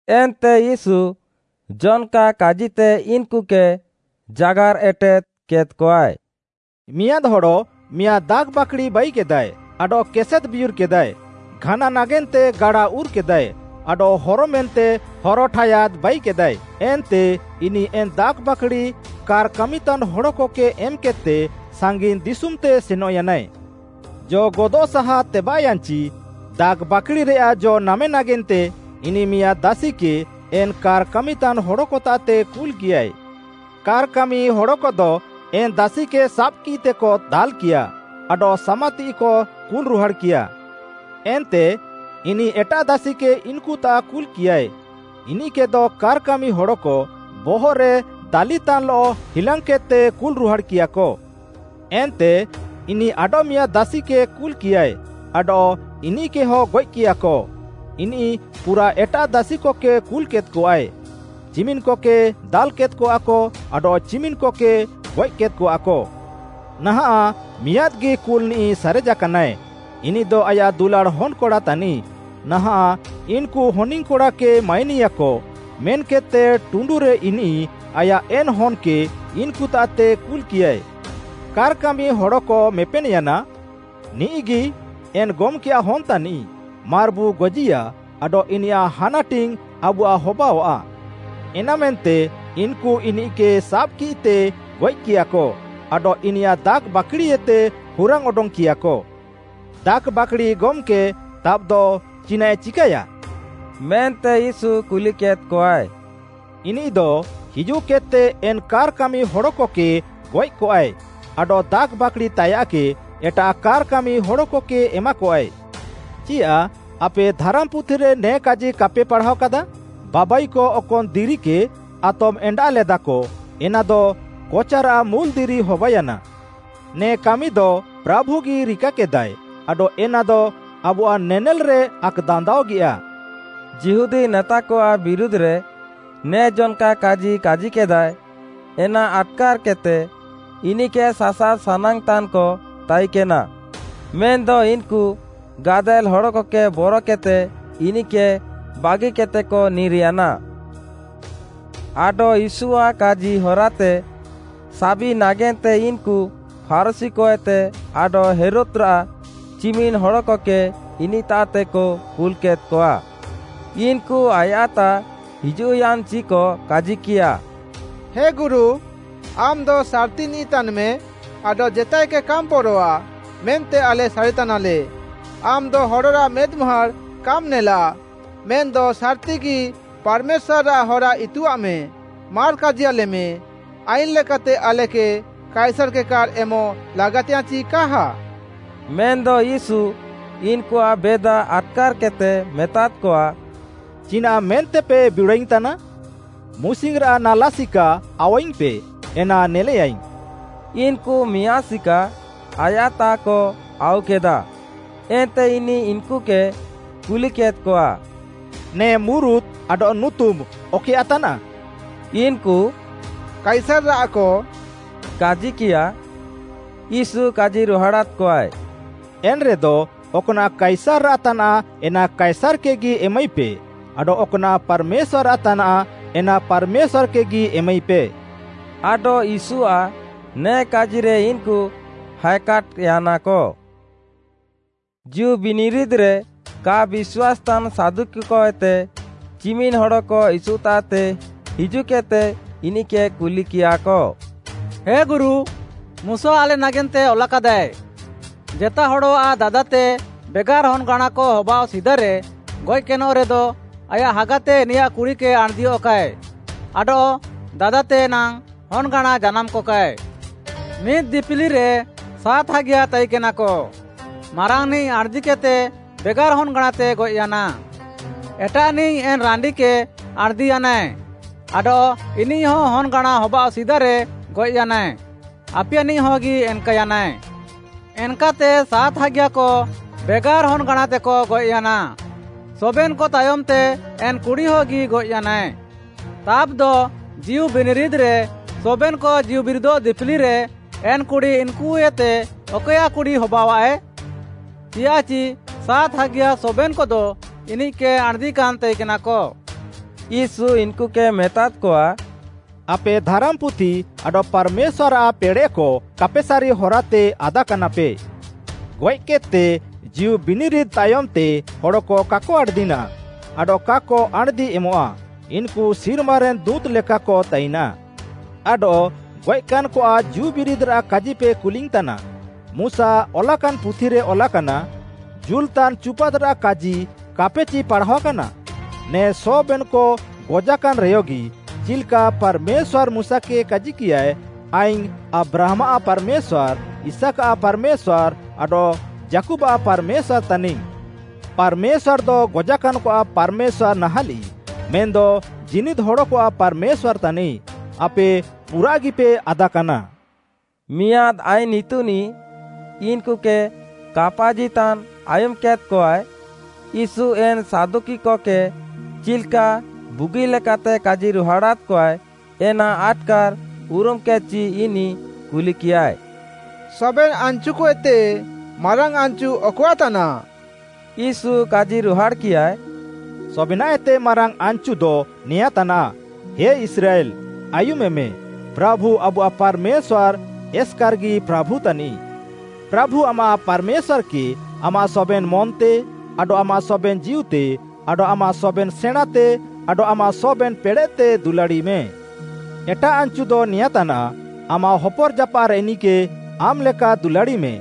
ଏନ୍ତେ ୟୀଶୁ ଜନ୍‌କା କାଜିତେ ଇନ୍‌କୁକେ ଜାଗାର୍‌ ଏଟେଦ୍‌କେଦ୍‌ଆଏ, “ମିଆଁଦ୍‌ ହଡ଼ ମିଆଁଦ୍‌ ଦାଖ୍‌ବାକ୍‌ଡ଼ି ବାଇକେଦାଏ, ଆଡଃ କେସେଦ୍‌ବିୟୁର୍‌କେଦାଏ, ଘାନା ନାଗେନ୍ତେ ଗାଡା ଉର୍‌କେଦାଏ, ଆଡଃ ହରମେନ୍ତେ ହରଠାୟାଦ୍‌ ବାଇକେଦାଏ, ଏନ୍ତେ ଇନିଃ ଏନ୍‌ ଦାଖ୍‌ବାକ୍‌ଡ଼ି କାର୍‌ କାମିତାନ୍ ହଡ଼କକେ ଏମ୍‌କେଦ୍‌ତେ ସାଙ୍ଗିନ୍‌ ଦିଶୁମ୍‌ତେ ସେନଃୟାନାଏ। ଜ ଗଦଃ ସାହା ତେବାଃୟାନ୍‌ଚି, ଦାଖ୍‌ବାକ୍‌ଡ଼ିରେୟାଃ ଜ ନାମେ ନାଗେନ୍ତେ ଇନିଃ ମିଆଁଦ୍‌ ଦାସିକେ ଏନ୍‌ କାର୍‌ କାମିତାନ୍ ହଡ଼କତାଃତେ କୁଲ୍‌କିୟାଏ। କାର୍‌ କାମି ହଡ଼କଦ ଏନ୍‌ ଦାସିକେ ସାବ୍‌କିତେକ ଦାଲ୍‌କିୟାଃ, ଆଡଃ ସାମାତିଃଇକ କୁଲ୍‌ରୁହାଡ଼୍‌କିୟା। ଏନ୍ତେ ଇନିଃ ଏଟାଃ ଦାସିକେ ଇନ୍‌କୁତାଃ କୁଲ୍‌କିୟାଏ, ଇନିଃକେଦ କାର୍‌କାମି ହଡ଼କ ବହଃରେ ଦାଲିତାନ୍‌ଲଃ ହିଲାଙ୍ଗ୍‌କେଦ୍‌ତେ କୁଲ୍‌ରୁହାଡ଼୍‌କିୟାକ। ଏନ୍ତେ ଇନିଃ ଆଡଃମିଆଁଦ୍‌ ଦାସିକେ କୁଲ୍‌କିୟାଏ, ଆଡଃ ଇନିଃକେହଁ ଗଏଃକିୟାକ। ଇନିଃ ପୁରାଃ ଏଟାଃ ଦାସିକକେ କୁଲ୍‌କେଦ୍‌କଆଏ, ଚିମିନ୍‌କକେ ଦାଲ୍‌କେଦ୍‌କଆକ, ଆଡଃ ଚିମିନ୍‌କକେ ଗଏଃକେଦ୍‌କଆକ। ନାହାଁଃ ମିଆଁଦ୍‌ଗି କୁଲଃନିଃ ସାରେଜାକାନାଏ, ଇନିଃଦ ଆୟାଃ ଦୁଲାଡ଼୍‌ ହନ୍‌କଡ଼ା ତାନିଃ। ନାହାଁଃ ଇନ୍‌କୁ ହନିଙ୍ଗ୍‌କଡ଼ାକେ ମାଇନିୟାକ, ମେନ୍‌କେଦ୍‌ତେ ଟୁଣ୍ଡୁରେ ଇନିଃ ଆୟାଃ ଏନ୍‌ ହନ୍‌କେ ଇନ୍‌କୁତାଃତେ କୁଲ୍‌କିୟାଏ। କାର୍‌କାମି ହଡ଼କ ମେପେନ୍‌ୟାନା, ‘ନିଃଗି ଏନ୍‌ ଗମ୍‌କେୟାଃ ହନ୍‌ତାନିଃ, ମାର୍‌ବୁ ଗଜିୟା ଆଡଃ ଇନିୟାଃ ହାନାଟିଙ୍ଗ୍‌ ଆବୁଆଃ ହବାଅଆଃ।’ ଏନାମେନ୍ତେ ଇନ୍‌କୁ ଇନିଃକେ ସାବ୍‌କିତେ ଗଏଃକିୟାକ, ଆଡଃ ଇନିୟାଃ ଦାଖ୍‌ବାକ୍‌ଡ଼ିଏତେ ହୁରାଙ୍ଗ୍‌ ଅଡଙ୍ଗ୍‌କିୟାଃକ। “ଦାଖ୍‌ବାକ୍‌ଡ଼ି ଗମ୍‌କେ ତାବ୍‌ଦ ଚିନାଃଆଏ ଚିକାୟା?” ମେନ୍ତେ ୟୀଶୁ କୁଲିକେଦ୍‌କଆଏ। “ଇନିଃଦ ହିଜୁଃକେଦ୍‌ତେ ଏନ୍‌ କାର୍‌ କାମିହଡ଼କକେ ଗଏଃକଆଏ, ଆଡଃ ବାଖ୍‌ଡ଼ିତାୟାଃକେ ଏଟାଃ କାର୍‌ କାମିହଡ଼କକେ ଏମାକଆଏ। ଚିୟାଃ ଆପେ ଧାରାମ୍‌ପୁଥିରେ ନେ କାଜି କାପେ ପାଢ଼ାଅକାଦାଃ? “‘ବାବାଇକ ଅକନ୍‌ ଦିରିକେ ଆତମ୍‌ ଏଣ୍ଡାଃଲେଦାକ ଏନାଦ କଚାରାଃ ମୁଲ୍‌ଦିରି ହବାୟାନା। ନେ କାମିଦ ପ୍ରାଭୁଗି ରିକାକେଦାଏ ଆଡଃ ଏନାଦ ଆବୁଆଃ ନେନେଲ୍‌ରେ ଆକ୍‌ଦାନ୍ଦାଅଗିୟା।’” ଯିହୁଦୀ ନେତାକଆଃ ବିରୁଧ୍‌ରେ ନେ ଜନ୍‌କା କାଜି କାଜିକେଦାଏ ଏନା ଆଟ୍‌କାର୍‌କେଦ୍‌ତେ ଇନିଃକେ ସାସାବ୍ ସାନାଙ୍ଗ୍‌ତାନ୍‌କ ତାଇକେନା, ମେନ୍‌ଦ ଇନ୍‌କୁ ଗାଦେଲ୍‌ ହଡ଼କକେ ବରକେଦ୍‌ତେ ଇନିଃକେ ବାଗିକେଦ୍‌ତେକ ନିର୍‌ୟାନା। ଆଡଃ ୟୀଶୁଆଃ କାଜି ହରାତେ ସାବି ନାଗେନ୍ତେ ଇନ୍‌କୁ ଫାରୁଶୀକଏତେ ଆଡଃ ହେରୋଦ୍‌ରାଃ ଚିମିନ୍‌ ହଡ଼କକେ ଇନିଃତାଃତେକ କୁଲ୍‌କେଦ୍‌କଆ। ଇନ୍‌କୁ ଆୟାଃତାଃ ହିଜୁଃୟାନ୍‌ଚିକ କାଜିକିୟା, “ହେ ଗୁରୁ, ଆମ୍‌ଦ ସାର୍‌ତିନିଃ ତାନ୍‌ମେ ଆଡଃ ଜେତାଏକେ କାମ୍‌ ବରଆଃ ମେନ୍ତେ ଆଲେ ସାରିତାନାଲେ, ଆମ୍‌ଦ ହଡ଼ରାଃ ମେଦ୍‌ମୁହାଁଡ଼୍‌ କାମ୍‌ ନେଲାଃ, ମେନ୍‌ଦ ସାର୍‌ତିଗି ପାର୍‌ମେଶ୍ୱାର୍‌ରାଃ ହରା ଇତୁଆଃମେ, ମାର୍‌ କାଜିୟାଲେମେ, ଆଇନ୍‌ ଲେକାତେ ଆଲେକେ କାଇସାର୍‌କେ କାର୍‌ ଏମଃ ଲାଗାତିୟାଃଁ ଚି କାହା?” ମେନ୍‌ଦ ୟୀଶୁ ଇନ୍‌କୁଆଃ ବେଦା ଆଟ୍‌କାର୍‌କେଦ୍‌ତେ ମେତାଦ୍‌କଆ, “ଚିନାଃ ମେନ୍ତେପେ ବିଡ଼ାଅଇଙ୍ଗ୍‌ ତାନା? ମୁସିଙ୍ଗ୍‌ରାଃ ନାଲା ସିକା ଆଉୱାଇଙ୍ଗ୍‌ପେ, ଏନା ନେଲେଆଇଙ୍ଗ୍‌।” ଇନ୍‌କୁ ମିଆଁଦ୍‌ ସିକା ଆୟାଃତାଃକ ଆଉକେଦା, ଏନ୍ତେ ଇନିଃ ଇନ୍‌କୁକେ କୁଲିକେଦ୍‌କଆ, “ନେ ମୁରୁତ୍‌ ଆଡଃ ନୁତୁମ୍‌ ଅକଏୟାଃ ତାନାଃ?” ଇନ୍‌କୁ “କାଇସାର୍‌ରାଃକ” କାଜିକିୟା। ୟୀଶୁ କାଜିରୁହାଡ଼ାଦ୍‌କଆଏ, “ଏନ୍‌ରେଦ ଅକ୍‌ନାଃ କାଇସାର୍‌ରାଃ ତାନାଃ ଏନା କାଇସାର୍‌କେଗି ଏମାଇପେ, ଆଡଃ ଅକ୍‌ନାଃ ପାର୍‌ମେଶ୍ୱାର୍‌ରାଃ ତାନାଃ ଏନା ପାର୍‌ମେଶ୍ୱାର୍‌କେଗି ଏମାଇପେ।” ଆଡଃ ୟୀଶୁଆଃ ନେ କାଜିରେ ଇନ୍‌କୁ ହାଏକାଟ୍‍ୟାନାକ। ଜୀଉବିନିରିଦ୍‌ରେ କା ବିଶ୍ୱାସେତାନ୍‌ ସାଦୁକିକଏତେ ଚିମିନ୍‌ ହଡ଼କ ୟୀଶୁତାଃତେ ହିଜୁଃକେଦ୍‌ତେ ଇନିଃକେ କୁଲିକିୟାଃକ: “ହେ ଗୁରୁ, ମୁଶା ଆଲେ ନାଗେନ୍ତେ ଅଲାକାଦାଏ, ଜେତାଏ ହଡ଼ଆଃ ଦାଦାତେ ବେଗାର୍‌ ହନ୍‌ଗାଁଣାକ ହବାଅଃ ସିଦାରେ ଗଏଃକେନଃ ରେଦ, ଆୟାଃ ହାଗାତେ ଇନିୟାଃ କୁଡ଼ିକେ ଆଣ୍‌ଦିୟଃକାଏ, ଆଡଃ ଦାଦାତେ ନାଙ୍ଗ୍‌ ହନ୍‌ଗାଁଣା ଜାନାମ୍‌କକାଏ। ମିଦ୍‌ ଦିପିଲିରେ ସାତ୍‌ ହାଗିୟା ତାଇନ୍‌କେନାକ ମାରାଙ୍ଗ୍‌ନିଃ ଆଣ୍‍ଦିକେଦ୍‍ତେ ବେଗାର୍‌ ହନ୍‌ଗାଁଣାତେ ଗଏଃୟାନାଏ। ଏଟାଃନିଃ ଏନ୍‌ ରାଣ୍ଡିକେ ଆଣ୍‌ଦିୟାନାଏ ଆଡଃ ଇନିଃହ ହନ୍‌ଗାଁଣା ହବାଅଃ ସିଦାରେ ଗଏଃୟାନା, ଆପିୟାନିଃହଗି ଏନ୍‌କାୟାନାଏ। ଏନ୍‌କାତେ ସାତ୍‌ ହାଗିୟାକ ବେଗାର୍ ହନ୍‌ଗାଁଣାତେକ ଗଏଃୟାନା, ସବେନ୍‌କ ତାୟମ୍‌ତେ ଏନ୍‌ କୁଡ଼ିୟଗି ଗଏଃୟାନାଏ। ତାବ୍‌ଦ ଜୀଉବିନିରିଦ୍‌ରେ, ସବେନ୍‌କ ଜୀଉବିରିଦଃ ଦିପିଲିରେ, ଏନ୍‌ କୁଡ଼ି ଇନ୍‌କୁଏତେ ଅକଏୟାଃ କୁଡ଼ି ହବାଅଆଃଏ? ଚିୟାଃଚି ସାତ୍‌ ହାଗିୟା ସବେନ୍‌କଦ ଇନିଃକେ ଆଣ୍‌ଦିକାନ୍‌ ତାଇକେନାକ।” ୟୀଶୁ ଇନ୍‌କୁକେ ମେତାଦ୍‌କଆ, “ଆପେ ଧାରାମ୍‌ପୁଥି ଆଡଃ ପାର୍‌ମେଶ୍ୱାର୍‌ଆଃ ପେଡ଼େଃକ କାପେସାରି ହରାତେ ଆଦାକାନାପେ। ଗଏଃକେଦ୍‌ତେ ଜୀଉ ବିନିରିଦ୍‌ ତାୟମ୍‌ତେ ହଡ଼କ କାକ ଆଣ୍‌ଦିନାଃ ଆଡଃ କାକ ଆଣ୍‌ଦି ଏମଃଆ, ଇନ୍‌କୁ ସିର୍ମାରେନ୍‌ ଦୁଁତ୍‌କ ଲେକାକ ତାଇନାଃ। ଆଡଃ ଗଏଃକାନ୍‌କଆଃ ଜୀଉବିରିଦ୍‌ରାଃ କାଜିପେ କୁଲିଙ୍ଗ୍‌ତାନା, ମୁଶା ଅଲାକାନ୍‌ ପୁଥିରେ ଅଲାକାନା, ଜୁଲଃତାନ୍ ଚୁପାଦ୍‌ରାଃ କାଜି କାପେଚି ପାଢ଼ାଅକାନା? ନେ ସବେନ୍‌କ ଗଜାକାନ୍‌ରେୟଗି, ଚିଲ୍‌କା ପାର୍‌ମେଶ୍ୱାର୍‌ ମୁଶାକେ କାଜିକିୟାଏ, ଆଇଙ୍ଗ୍‌ ଆବ୍ରାହାମ୍‌ଆଃ ପାର୍‌ମେଶ୍ୱାର୍‌, ଇସାକ୍‌ଆଃ ପାର୍‌ମେଶ୍ୱାର୍‌, ଆଡଃ ଯାକୁବ୍‌ଆଃ ପାର୍‌ମେଶ୍ୱାର୍‌ ତାନିଙ୍ଗ୍‌। ପାର୍‌ମେଶ୍ୱାର୍‌ଦ ଗଜାକାନ୍‌କଆଃ ପାର୍‌ମେଶ୍ୱାର୍‌ ନାହାଁଲିଃ ମେନ୍‌ଦ ଜୀନିଦ୍‌ ହଡ଼କଆଃ ପାର୍‌ମେଶ୍ୱାର୍‌ ତାନିଃ। ଆପେ ପୁରାଃଗିପେ ଆଦାକାନା।” ମିଆଁଦ୍‌ ଆଇନ୍‌ ଇତୁନିଃ ଇନ୍‌କୁକେ କାପାଜିତାନ୍ ଆୟୁମ୍‌କେଦ୍‌କଆଏ। ୟୀଶୁ ଏନ୍‌ ସାଦୁକିକକେ ଚିଲ୍‌କା ବୁଗିଲେକାତେ କାଜିରୁହାଡ଼ାଦ୍‌କଆଏ ଏନା ଆଟ୍‌କାର୍‌ ଉରୁମ୍‌କେଦ୍‌ଚି, ଇନିଃ କୁଲିକିୟାଏ, “ସବେନ୍‌ ଆନ୍‌ଚୁକଏତେ, ମାରାଙ୍ଗ୍‌ ଆନ୍‌ଚୁ ଅକଆଃ ତାନାଃ?” ୟୀଶୁ କାଜିରୁହାଡ଼୍‌କିୟାଏ, “ସବେନାଃଏତେ ମାରାଙ୍ଗ୍‌ ଆନ୍‌ଚୁଦ ନେଆଁଁତାନାଃ, ହେ ଇସ୍ରାଏଲ୍‌, ଆୟୁମେମେ, ପ୍ରାଭୁ ଆବୁଆଃ ପାର୍‌ମେଶ୍ୱାର୍‌, ଏସ୍‌କାର୍‌ଗି ପ୍ରାଭୁତାନିଃ। ପ୍ରାଭୁ ଆମାଃ ପାର୍‌ମେଶ୍ୱାର୍‌କେ ଆମାଃ ସବେନ୍‌ ମନ୍‌ତେ, ଆଡଃ ଆମାଃ ସବେନ୍‌ ଜୀଉତେ, ଆଡଃ ଆମାଃ ସବେନ୍‌ ସେଣାଁଁତେ, ଆଡଃ ଆମାଃ ସବେନ୍‌ ପେଡ଼େଃତେ ଦୁଲାଡ଼ିମେ। ଏଟାଃ ଆନ୍‌ଚୁଦ ନେଆଁଁତାନାଃ, ଆମାଃ ହପର୍‌ଜାପାଃରେନିଃକେ ଆମ୍‌ଲେକା ଦୁଲାଡ଼ିମେ।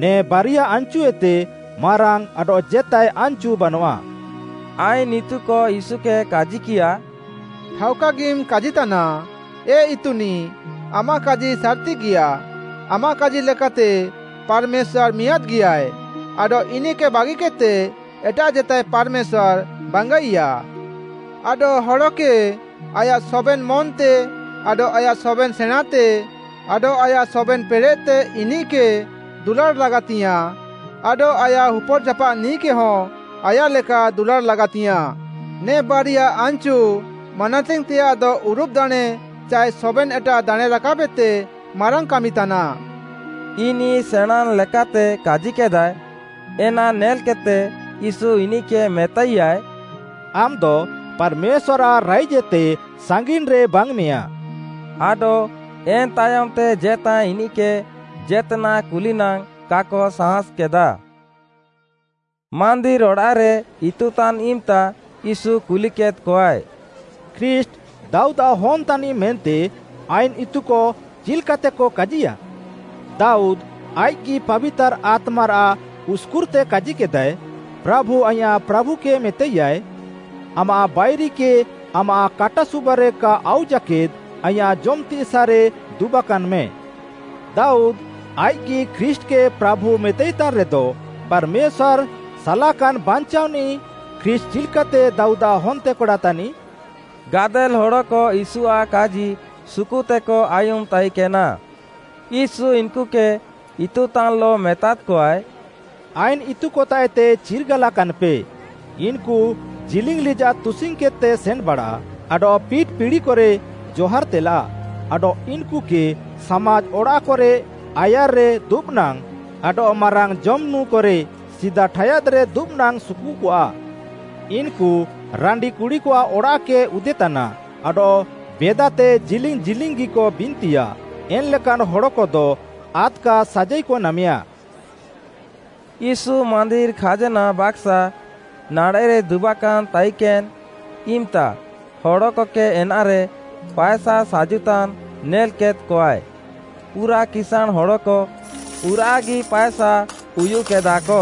ନେ ବାରିଆଃ ଆନ୍‌ଚୁଏତେ, ମାରାଙ୍ଗ୍‌ ଆଡଃ ଜେତାଏ ଆନ୍‌ଚୁ ବାନଆଃ।” ଆଇନ୍‌ ଇତୁକ ୟୀଶୁକେ କାଜିକିୟାଃ, “ଠାଉକାଗିମ୍ କାଜିତାନା, ଏ ଇତୁନିଃ, ଆମାଃ କାଜି ସାର୍‌ତିଗିଆଃ, ଆମାଃ କାଜି ଲେକାତେ ପାର୍‌ମେଶ୍ୱାର୍‌ ମିଆଁଦ୍‌ଗିଆଏଃ, ଆଡଃ ଇନିଃକେ ବାଗିକେଦ୍‌ତେ ଏଟାଃ ଜେତାଏ ପାର୍‌ମେଶ୍ୱାର୍‌ ବାଙ୍ଗାଇଆଃ। ଆଡଃ ହଡ଼କେ, ଆୟାଃ ସବେନ୍‌ ମନ୍‌ତେ, ଆଡଃ ଆୟାଃ ସବେନ୍‌ ସେଣାଁଁତେ, ଆଡଃ ଆୟାଃ ସବେନ୍‌ ପେଡ଼େଃତେ ଇନିଃକେ ଦୁଲାଡ଼୍‌ ଲାଗାତିୟାଃଁ ଆଡଃ ଆୟାଃ ହପର୍‌ଜାପାଃନିଃକେହ ଆୟାଃ ଲେକା ଦୁଲାଡ଼୍‌ ଲାଗାତିୟାଃଁ। ନେ ବାରିଆ ଆନ୍‌ଚୁ ମାନାତିଙ୍ଗ୍‌ତେଆଃଦ ଉରୁବଃ ଦାଣେଁ ଚାଏ ସବେନ୍‌ ଏଟାଃ ଦାଣେଁରାକାବ୍‌ଏତେ ମାରାଙ୍ଗ୍‌ କାମିତାନାଃ।” ଇନିଃ ସେଣାଁଁନ୍‌ ଲେକାତେ କାଜିକେଦାଏ, ଏନା ନେଲ୍‌କେଦ୍‌ତେ ୟୀଶୁ ଇନିଃକେ ମେତାଇୟାଏ, “ଆମ୍‌ଦ ପାର୍‌ମେଶ୍ୱାର୍‌ଆଃ ରାଇଜ୍‌ଏତେ ସାଙ୍ଗିନ୍‌ରେ ବାଙ୍ଗ୍‌ମେଆଁଃ।” ଆଡଃ ଏନ୍‌ତାୟମ୍‌ତେ ଜେତାଏ ଇନିଃକେ ଜେତ୍‌ନାଃ କୁଲିନାଙ୍ଗ୍‌ କାକ ସାହାଁସ୍‌କେଦା। ମାନ୍ଦିର୍‌ ଅଡ଼ାଃରେ ଇତୁତାନ୍‌ ଇମ୍‌ତା ୟୀଶୁ କୁଲିକେଦ୍‌କଆଏ, “ଖ୍ରୀଷ୍ଟ୍‌ ଦାଉଦ୍‌ଆଃ ହନ୍‌ ତାନିଃ ମେନ୍ତେ ଆଇନ୍‌ ଇତୁକ ଚିଲ୍‌କାତେକ କାଜିୟାଃ? ଦାଉଦ୍‌ ଆଇଃକ୍‌ଗି ପାବିତାର୍‌ ଆତ୍ମାରାଃ ଉସ୍‌କୁର୍‌ତେ କାଜିକେଦାଏ, “‘ପ୍ରାଭୁ ଆଇଁୟାଃ ପ୍ରାଭୁକେ ମେତାଇୟାଏ; ଆମାଃ ବାଇରିକକେ ଆମାଃ କାଟାସୁବାରେ କା ଆଉ ଜାକେଦ୍‌ ଆଇଁୟାଃ ଜମ୍‌ତିସାଃରେ ଦୁବାକାନ୍‌ମେ।’” ଦାଉଦ୍‌ ଆଇଃକ୍‌ଗି ଖ୍ରୀଷ୍ଟ୍‌କେ ପ୍ରାଭୁ ମେତାଇତାନ୍‌ରେଦ, ପାର୍‌ମେଶ୍ୱାର୍‌ଆଃ ସାଲାକାନ୍‌ ବଞ୍ଚାଅନିଃ ଖ୍ରୀଷ୍ଟ୍‌ ଚିଲ୍‌କାତେ ଦାଉଦ୍‌ଆଃ ହନ୍ତେକଡ଼ା ତାନିଃ? ଗାଦେଲ୍‌ ହଡ଼କ ୟୀଶୁଆଃ କାଜି ସୁକୁତେକ ଆୟୁମ୍‌ ତାଇକେନା। ୟୀଶୁ ଇନ୍‌କୁକେ ଇତୁତାନ୍‌ଲଃ ମେତାଦ୍‌କଆଏ, “ଆଇନ୍‌ ଇତୁକତାଃଏତେ ଚିର୍ଗାଲାକାନ୍‌ପେ। ଇନ୍‌କୁ ଜିଲିଙ୍ଗ୍‌ ଲିଜାଃ ତୁସିଙ୍ଗ୍‌କେଦ୍‌ତେ ସେନ୍‌ବାଡ଼ା, ଆଡଃ ପିଟ୍‌ ପିଡ଼ିକରେ ଜହାର୍‌ତେଲା, ଆଡଃ ଇନ୍‌କୁକେ ସାମାଜ୍‌ ଅଡ଼ାଃକରେ ଆୟାର୍‌ରେ ଦୁବ୍‌ନାଙ୍ଗ୍‌, ଆଡଃ ମାରାଙ୍ଗ୍‌ ଜମ୍‌ନୁଁକରେ ସିଦା ଠାୟାଦ୍‌ରେ ଦୁବ୍‌ନାଙ୍ଗ୍‌ ସୁକୁକଆ। ଇନ୍‌କୁ ରାଣ୍ଡିକୁଡ଼ିକଆଃ ଅଡ଼ାଃକ ଉଦେତାନା ଆଡଃ ବେଦାତେ ଜିଲିଙ୍ଗ୍‌ ଜିଲିଙ୍ଗ୍‌ଗିକ ବିନ୍ତିୟା। ଏନ୍‌ଲେକାନ୍‌ ହଡ଼କଦ ଆଦ୍‌କା ସାଜାଇକ ନାମେୟା।” ୟୀଶୁ ମାନ୍ଦିର୍‌ ଖାଜ୍‌ନା ବାକାସ୍‌ ନାଡ଼େଃରେ ଦୁବାକାନ୍‌ ତାଇକେନ୍‌ ଇମ୍‌ତା ହଡ଼କକେ ଏନାରେ ପାଏସା ସାଜୁତାନ୍‌ ନେଲ୍‌କେଦ୍‌କଆଏ। ପୁରାଃ କିସାଁଣ୍‌ ହଡ଼କ ପୁରାଃଗି ପାଏସା ଉୟୁଃକେଦାଃକ।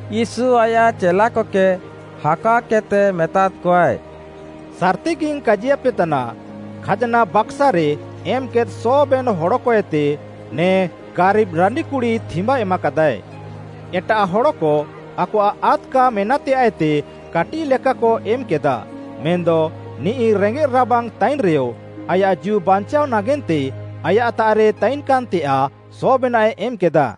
ୟୀଶୁ ଆୟାଃ ଚେଲାକକେ ହାକାଅକେଦ୍‌ତେ ମେତାଦ୍‌କଆଏ, “ସାର୍‌ତିଗିଙ୍ଗ୍‌ କାଜିୟାପେତାନା, ଖାଜ୍‌ନା ବାକାସ୍‌ରେ ଏମ୍‌କେଦ୍ ସବେନ୍‌ ହଡ଼କ ଏତେ, ନେ ଗାରିବ୍‌ ରାଣ୍ଡିକୁଡ଼ି ଥିମ୍ୱା ଏମାକାଦାଃଏ। ଏଟାଃ ହଡ଼କ ଆକଆଃ ଆଦ୍‌କା ମେନାଃତେୟାଃଏତେ କାଟିଃଲେକାକ ଏମ୍‌କେଦାଃ; ମେନ୍‌ଦ ନିଃ ରେଙ୍ଗେଃ ରାବାଙ୍ଗ୍‌ ତାଇନ୍‌ରେୟ ଆୟାଃ ଜୀଉ ବାଞ୍ଚାଅ ନାଗେନ୍ତେ ଆୟାଃତାଃରେ ତାଇକେନ୍‌ତେୟାଃ ସବେନାଃଏ ଏମ୍‌କେଦା।”